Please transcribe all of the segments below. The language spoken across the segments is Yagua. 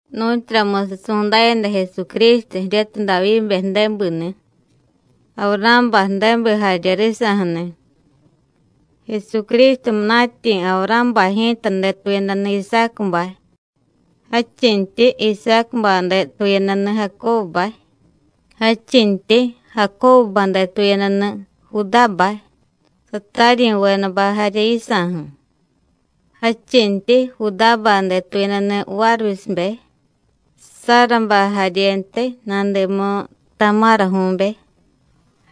Nu̱tyuramusiy su̱ndayada Jesucrístu jiryatiy Davyíbe ju̱débini̱, Avurá̱bay ju̱débi jarye risa̱ju̱ni̱. Jesucrístu munatyi̱ Avurá̱bay ji̱ta detuyadani̱ Isácubay, jadchintyi Isácubay detuyadani̱ Jacóbubay, jadchintyi Jacóbubay detuyadani̱ Judábay, sataryi̱vedabay jarye yisa̱ju̱. Jadchintyi Judábay detuyadani̱ Várvisibe, Sárabay jaryentiy nadimu Tamáraju̱be,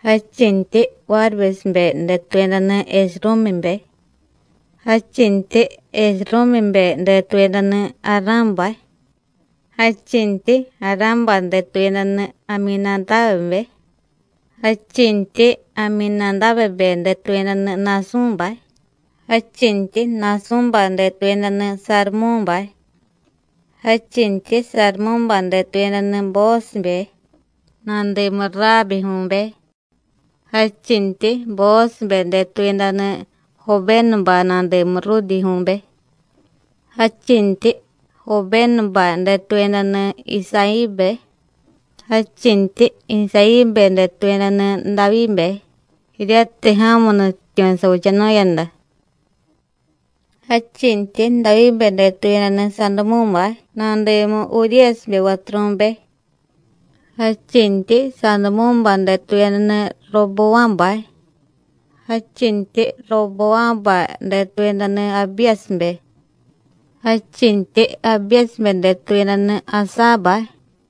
jadchintyi Várvisibe detuyadani̱ Esrúmibe, jadchintyi Esrúmibe detuyadani̱ Ará̱bay. Jadchintyi Ará̱bay detuyadani̱ Amyinadábebe, jadchintyi Amyinadábebe detuyadani̱ Na̱sú̱bay, jadchintyi Na̱sú̱bay detuyadani̱ Sarumú̱bay. Jadchintyi Sarumú̱bay detuyadani̱ Boósibe nadimu Raábiju̱be, jadchintyi Boósibe detuyadani̱ Jobénubay nadimu Rúdiju̱be; jadchintyi Jobénubay detuyadani̱ Isayíbe. Jadchintyi Isayíbe detuyadani̱ Davyíbe jiryatiy ja̱mu nutyityu̱ savichanu̱yada. Jadchintyi Davyíbe detuyadani̱ Sadumú̱bay nadimu Uríyasibe vaturu̱be. Jadchintyi Sadumú̱bay detuyadani̱ Robová̱bay, jadchintyi Robová̱bay detuyadani̱ Abíyasibe, jadchintyi Abíyasibe detuyadani̱ Asábay.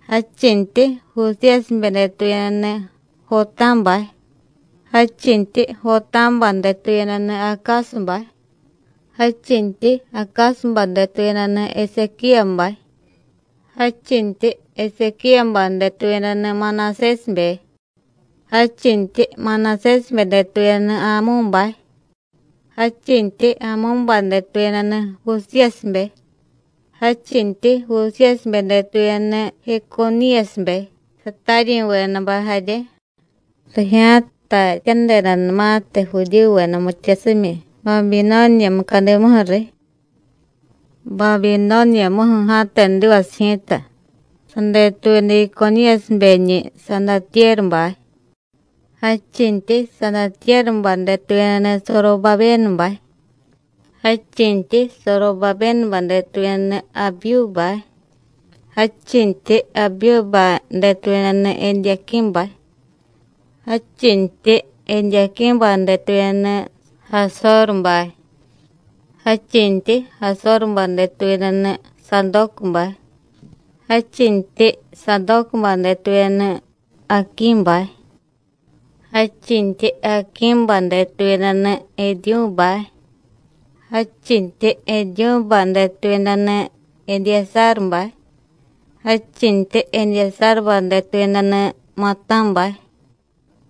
Jadchintyi Jusíyasibe detuyadani̱ Jotá̱bay, jadchintyi Jotá̱bay detuyadani̱ Acásubay, jadchintyi Acásubay detuyadani̱ Esequíyabay. Jadchintyi Esequíyabay detuyadani̱ Manasésibe, jadchintyi Manasésibe detuyadani̱ Amú̱bay, jadchintyi Amú̱bay detuyadani̱ Jusíyasibe. Jadchintyi Jusíyasibe detuyadani̱ Jeconíyasibe, sataryi̱vedabay jarye rijya̱tatyadedanumatiy Judíyuveda mityasimyi Babinóniya mucadimuju̱ riy. Babinóniyamuju̱ ja̱tedivasiy ji̱ta sadetuyada Jeconíyasibeñi̱ Sadatyérubay, jadchintyi Sadatyérubay detuyadani̱ Sorobabénubay. Jadchintyi Sorobabénubay detuyadani̱ Abiyúbay, jadchintyi Abiyúbay detuyadani̱ Edyaquí̱bay, jadchintyi Edyaquí̱bay detuyadani̱ Jasórubay. Jadchintyi Jasórubay detuyadani̱ Sadócubay, jadchintyi Sadócubay detuyadani̱ Aquí̱bay, jadchintyi Aquí̱bay detuyadani̱ Ediyúbay. Jadchintyi Ediyúbay detuyadani̱ Edyasárubay, jadchintyi Edyasárubay detuyadani̱ Matá̱bay,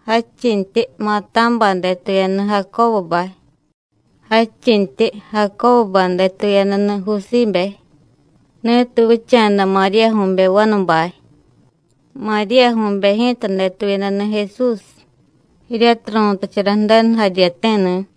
jadchintyi Matá̱bay detuyadani̱ Jacóbubay. Jadchintyi Jacóbubay detuyadani̱ Jusíbe, ni̱tiy vicha̱da Maríyaju̱be vanubay. Maríyaju̱be ji̱ta detuyadani̱ Jesús jiryatiy ru̱tachara Ju̱denu jaryeti̱ni̱.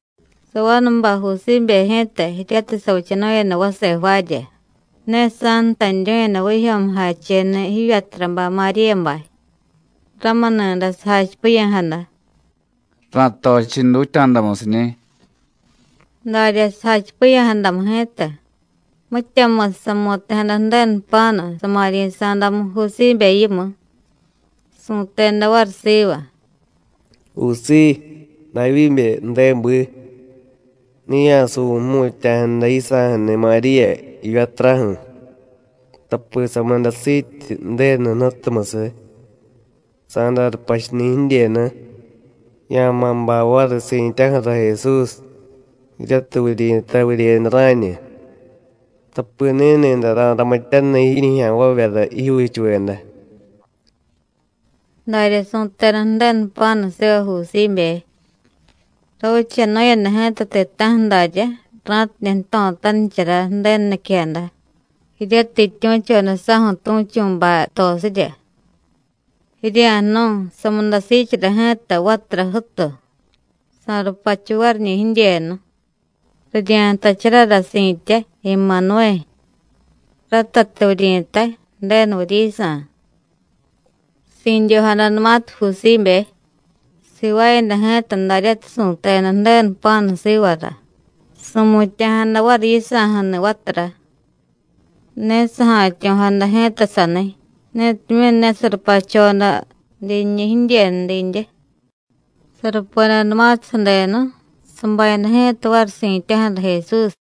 Savanubay Jusíbe ji̱ta, jiryatiy savichanu̱yada vase jvaarya, ne sa̱ntaniryu̱yada vijyo̱mujacheni̱ jivyaturabay Maríyabay. Ramuni̱day sajachipiya̱jada: “Ra̱tochiy dutya̱damusiñi̱.” Darya sajachipiya̱jadamu ji̱ta, mityamusiy samu̱ti̱jada Ju̱denu jpa̱nu sama̱ryi̱sa̱damu Jusíbe yimu, su̱teda variy siva: “Jusíy, Davyíbe ju̱débi, ne ya̱suvu̱y jmutya̱jada yisa̱ju̱ni̱ Maríya jivyaturaju̱, tapi samudasiityi Ju̱denu Jnutumusiy. Sa̱day rupachuni̱ jidyenu, ya̱ma̱ bay variy si̱tyaju̱ra Jesús jiryatiy vuryi̱tay Vuryeyada Rá̱ñu, tapi ni̱ni̱day ra̱ramityaniy jiñijya̱nvavyara jijyuuchuveda.” Darya su̱teda Ju̱denu jpa̱nu siva Jusíbe. Ravichanu̱yada ji̱ta ti̱ta̱ju̱ daryá, ra̱tidye jto̱tanichara Ju̱denu niquejada, jiryatiy jityu̱choda saju̱ tu̱chu̱bay jtosirya: “Jirya̱jnu̱y, sa̱mudasiichara ji̱ta vatura jútu, sa̱rupachu variñi̱ jidyenu. Rirya̱ntacharara si̱tya Emanuvé, ratatiy vuryi̱tay: Ju̱denu vuryisa̱.” Si̱dyojadanumatiy Jusíbe, sivaayada ji̱ta daryatiy su̱teda Ju̱denu jpa̱nu sivara, su̱mutya̱jada variy yisa̱ju̱ni̱ vatura. Ne saja̱tyo̱jada ji̱ta saniy, netimyu̱ ne sarupachoda dinñi̱ jidyenu didye. Sarupedanumatiy sadenu sabayada ji̱ta variy si̱tyaju̱ra Jesús.